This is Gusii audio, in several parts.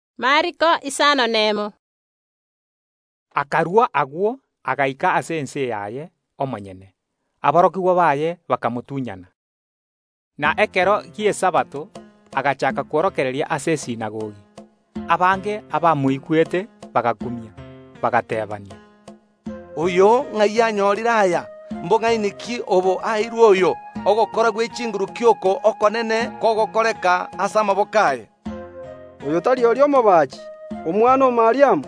Yeso akarua agwo, agaika ase ense yaye omonyene; aborokigwa baye bakamotunyana. Na ekero gi’Esabato agachaaka kworokereria ase esinagogi; abange abamoigwete bagakumia, bagateebania, “Oyo ng’ai anyorire aya? Mbong’aini ki obo aeirwe oyo? Ogokora gwe chinguru ki oko okonene kogokoreka ase amaboko aye? Oyo tari oria omobaachi, omwana o Mariamu,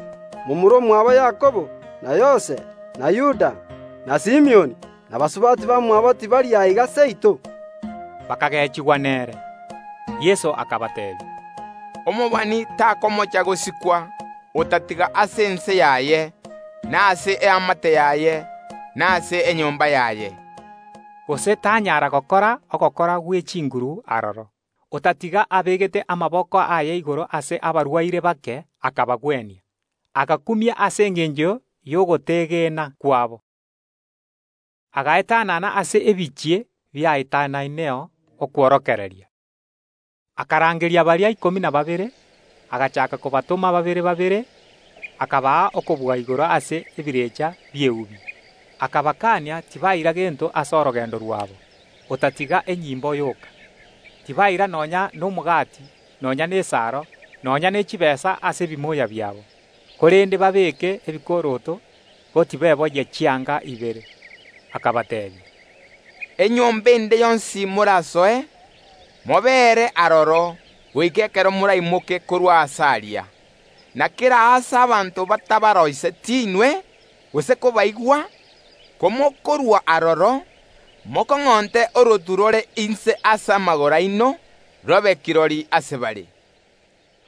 momura omwabo Yakobo, na Yose, na Yuda, na Simioni, na basubati bamwabo tibari aiga seito?” Bakagechigwa nere. Yeso akabateebia, “Omobani takomocha gosikwa, otatiga ase ense yaye, na ase eamate yaye, na ase enka yaye.” Gose tanyara gokora ogokora gwe chinguru aroro, otatiga abegete amaboko aye igoro ase abarwaire bake, akabagwenia. Agakumia ase engencho y’ogotegena kwabo. Agaetanana ase ebinyoro biaetanaineo okworokereria. Akarangeria baria ikomi na babere, agachaaka kobatoma babere babere, akabaa okobua igoro ase ebirecha bi’eubi; akabakaania tibaira gento ase orogendo rwabo, otatiga enyimbo yoka. Tibaira nonya nomogati, nonya nesaro, nonya nechitaabu ase ebimoya biabo. Korende babeeke ebikoroto, ko tibeboyia chianga ibere. Akabateebia, “Enyomba ende yonsi ase moraroisigwe, mobeere aroro goika ekero moraimoke korwa aase aria. Na kera aase abanto batabaroiseti inwe, gose kobaigwa, komokorua aroro, mokong’onte orotu rore inse ase amagoro aino, robe kirori ase bare.”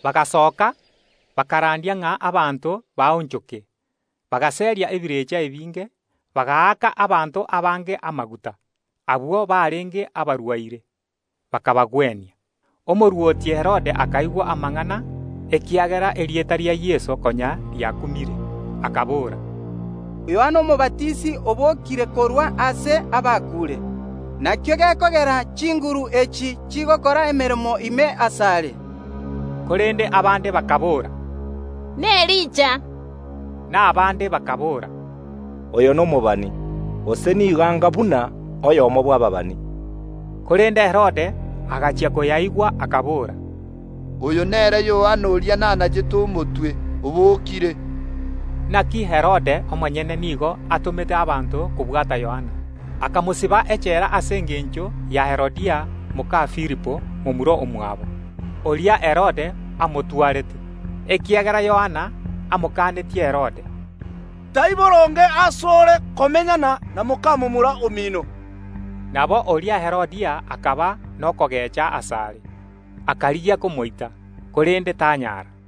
Bagasoka, bakarandia ng’a abanto baonchoke. Bagaseria ebirecha ebinge, bagaaka abanto abange amaguta, abwo barenge abarwaire, bakabagwenia. Omorwoti Herode akaigwa amang’ana, ekiagera erieta ria Yeso konya riakumire kera ase. Abanto bande bakaboora, “Yohana Omobatisi obokire korwa ase abakuure, nakio gekogera chinguru echi chigokora emeremo ime asare.” Korende abande bakaboora, “N’Elija.” Na abande bakaboora, “Oyo nomobani, gose nigo anga buna oyomo bw’ababani.” Korende Herode agachia koyaigwa, akabora, “Oyio Yohana oria nanachete omotwe, obokire.” Inaki Herode omonyene nigo atomete abanto kobwata Yohana, akamosiba echela ase engencho ya Herodia moka Filipo momura omwabo, oria Herode atwarete, ekiagera Yohana amokanetie Herode, “Tai boronge ase ore komenyana na moka momura omino.” Nabo oria Herodia akaba nokogecha asare, akarigia komoita, korende tanyara,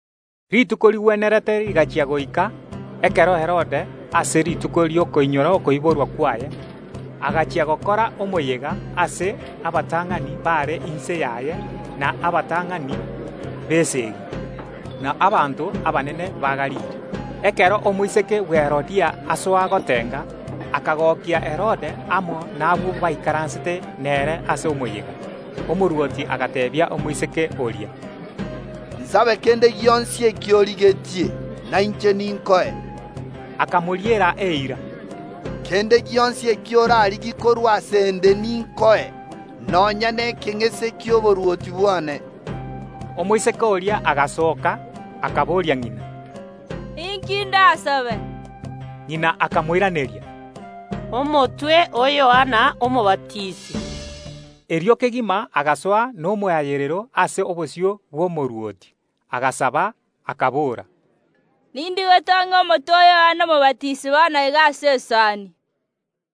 Rituko rigwenerete rigaika Herodia akanyora ribaga ekero Herode ase rituko ri’okoinyora okoiborwa kwaye ekero akora omoyega ase abatang’ani bare inse yaye, na abatang’ani b’esegi, na abanto abanene ba Galili. Erio omoiseke bwe Herodia gasoa gotenga, akagokia Herode amo nabwo baikaransete nere ase omoyega. Omorwoti agateebia omoiseke oria, “Nsabe kende gionsi ekio origetie, na inche ninkoe.” Akamoriera eira, “Kende gionsi ekio orarigie korwa ase ’nde ninkoe, nonya nekeng’ese ki’oborwoti bwane.” Omoiseke oria agasoka, akaboria ng’ina, “Inki ’ndasabe?” Ng’ina akamoiraneria, “Omotwe o Yohana Omobatisi.” Erio kegima agasoa nomoayerero ase obosio bw’omorwoti, agasaba, akabora, “Nindigetie ong’e omotwe o Yohana Omobatisi bono iga ase esani.”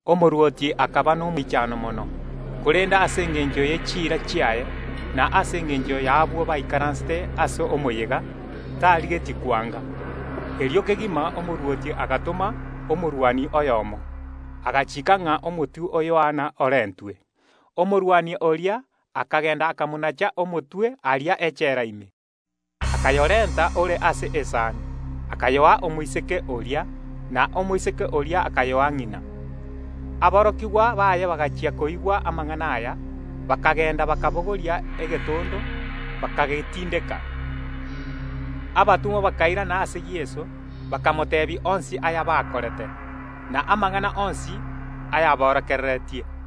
Omorwoti akaba nomoichano mono, korende ase engencho ye chiira chiaye, na ase engencho y’abwo baikaransete ase omoyega, tarigetie kwanga. Erio kegima omorwoti agatoma omorwani oyomo, agachiika ng’a omotwe o Yohana orentwe. Omorwani oria akagenda akamonacha omotwe aria echela ime, akayorenta ore ase esani, akayoa omoiseke oria, na omoiseke oria akayoa ng’ina. Ekero aborokigwa ba Yohana baigwete amang’ana aya, bakagenda bakabogoria egetondo, bakagetindeka. Abatomwa bakairana ase Yeso, bakamoteebia onsi ayabakorete, na amang’ana onsi aya aborokereretie.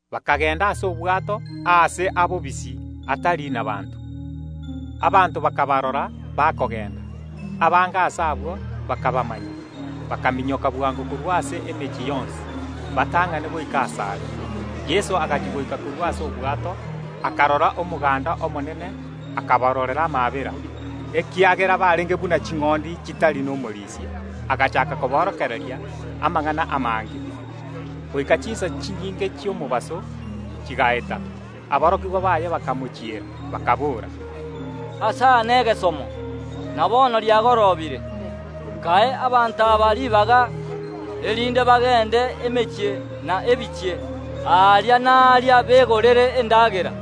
Bakagenda ase obwato, aase abobisi, atari nabaanto. Abanto bakabarora bakogenda, abange ase abwo bakabamanya, bakaminyoka bwango korwa ase emechie yonsi, batang’ane goika asare. Yeso agachia goika korwa ase obwato, akarora omoganda omonene, akabarorera amaabera, ekiagera barenge buna ching’ondi chitari nomorisia: agachaaka koborokereria amang’ana amange. Goika chinsa chinyinge chi’omobaso chigaeta, aborokigwa baye bakamochiera, bakaboora, “Aase aa negesomo, na bono riagorobire. Kae abanto aba ribaga, erinde bagende emechie na ebinyoro, aria na aaria, begorere endagera.”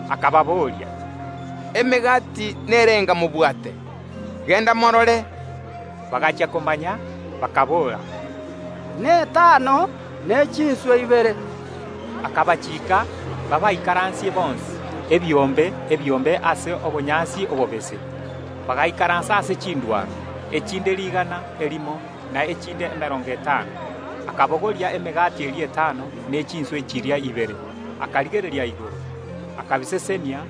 Akababoria, “Emegati nerenga mobwate? Genda morore!” Bagachia komanya bakaboora, “Netano, ne chinswe ibere.” Yeso akabachiika aborokigwa baye baabaikaransie bonsi, ebiombe, ebiombe, ase obonyansi obobese. Bagaikaransa ase chindwaro, echinde rigana erimo na echinde emerongo etano. Erio Yeso akabogoria emegati eria etano ne chinswe chiria ibere, akarigereria igoro, akabisesenia,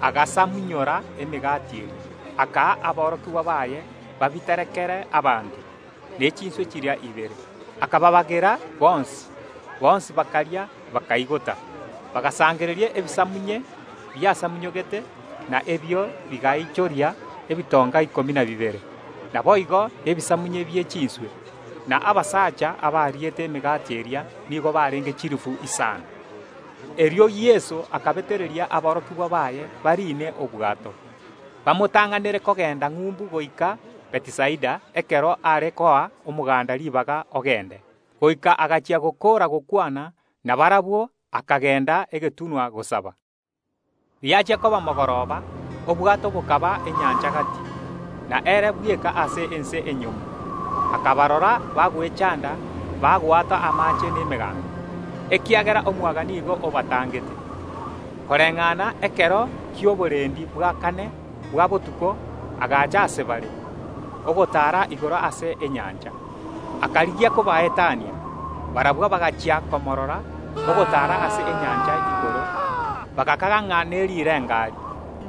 agasamunyora emegati eria, akaa aborokigwa baye babiterekere abanto, ne chinswe chiria ibere, akabagabera bonsi. Bonsi bakaria, bakaigota. Bagasangereria ebisamunye biasamunyogete, na ebio bigaichoria ebitonga ikomi na bibere, naboigo nebisamunye bie chinswe. Na abasacha abariete emegati eria nigo barenge chilifu isano. Erio Yeso akabetereria aborokigwa baye bariine obwato, bamotang’anere kogenda ng’umbu goika Bethisaida ekero are koa omoganda ribaga ogende. Magega gakorire gokwana nabarabwo, akagenda egetunwa gosaba. Riachia koba mogoroba, obwato bokaba enyancha gati, na ere bweka ase ense enyomo. Akabarora bagwechanda bagwata amaache nemegango, ekiagera omwaga nigo obatangete. Koreng’ana ekero ki’oborendi bwa kane bwa botuko agacha ase bare, ogotaara igoro ase enyancha, akarigia kobaetania. Barabwo bagachia komorora ogotaara ase enyancha igoro, bagakaga ng’a nerirengari,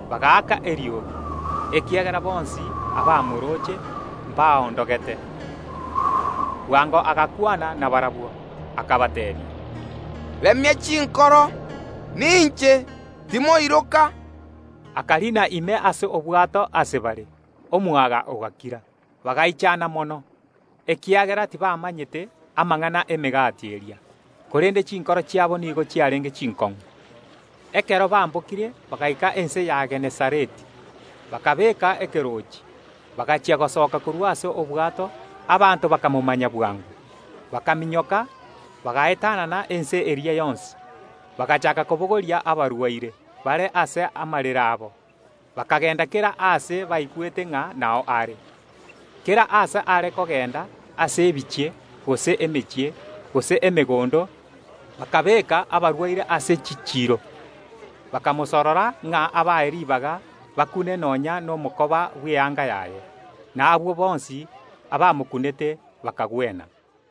bagaaka eriogi, ekiagera bonsi abamorooche mbaondogete. Bwango Yeso agakwana nabarabwo, akabateebia, “Remia chinkoro! Ninche. Timoiroka!” Akariina ime ase obwato ase bare; omwaga ogakira. Aborokigwa bagaichana mono, ekiagera tibamanyete amang’ana y’emegati eria, korende chinkoro chiabo nigo chiarenge chinkong’u. Ekero bambokire bagaika ense ya Genesareti, bakabeeka ekeroochi. Bagachia gosoka korwa ase obwato, abanto bakamanya Yeso bwango, bakaminyoka, bagaetanana ense eria yonsi, bagachaaka kobogoria abarwaire bare ase amarere abo, bakagenda kera aase baigwete ng’a nao are. Kera aase are kogenda ase ebinyoro, gose emechie, gose emegondo, bakabeeka abarwaire ase chichiiro, bakamosorora ng’a abae ribaga bakune nonya nomokoba bw’eanga yaye; na abwo bonsi abamokunete bakagwena.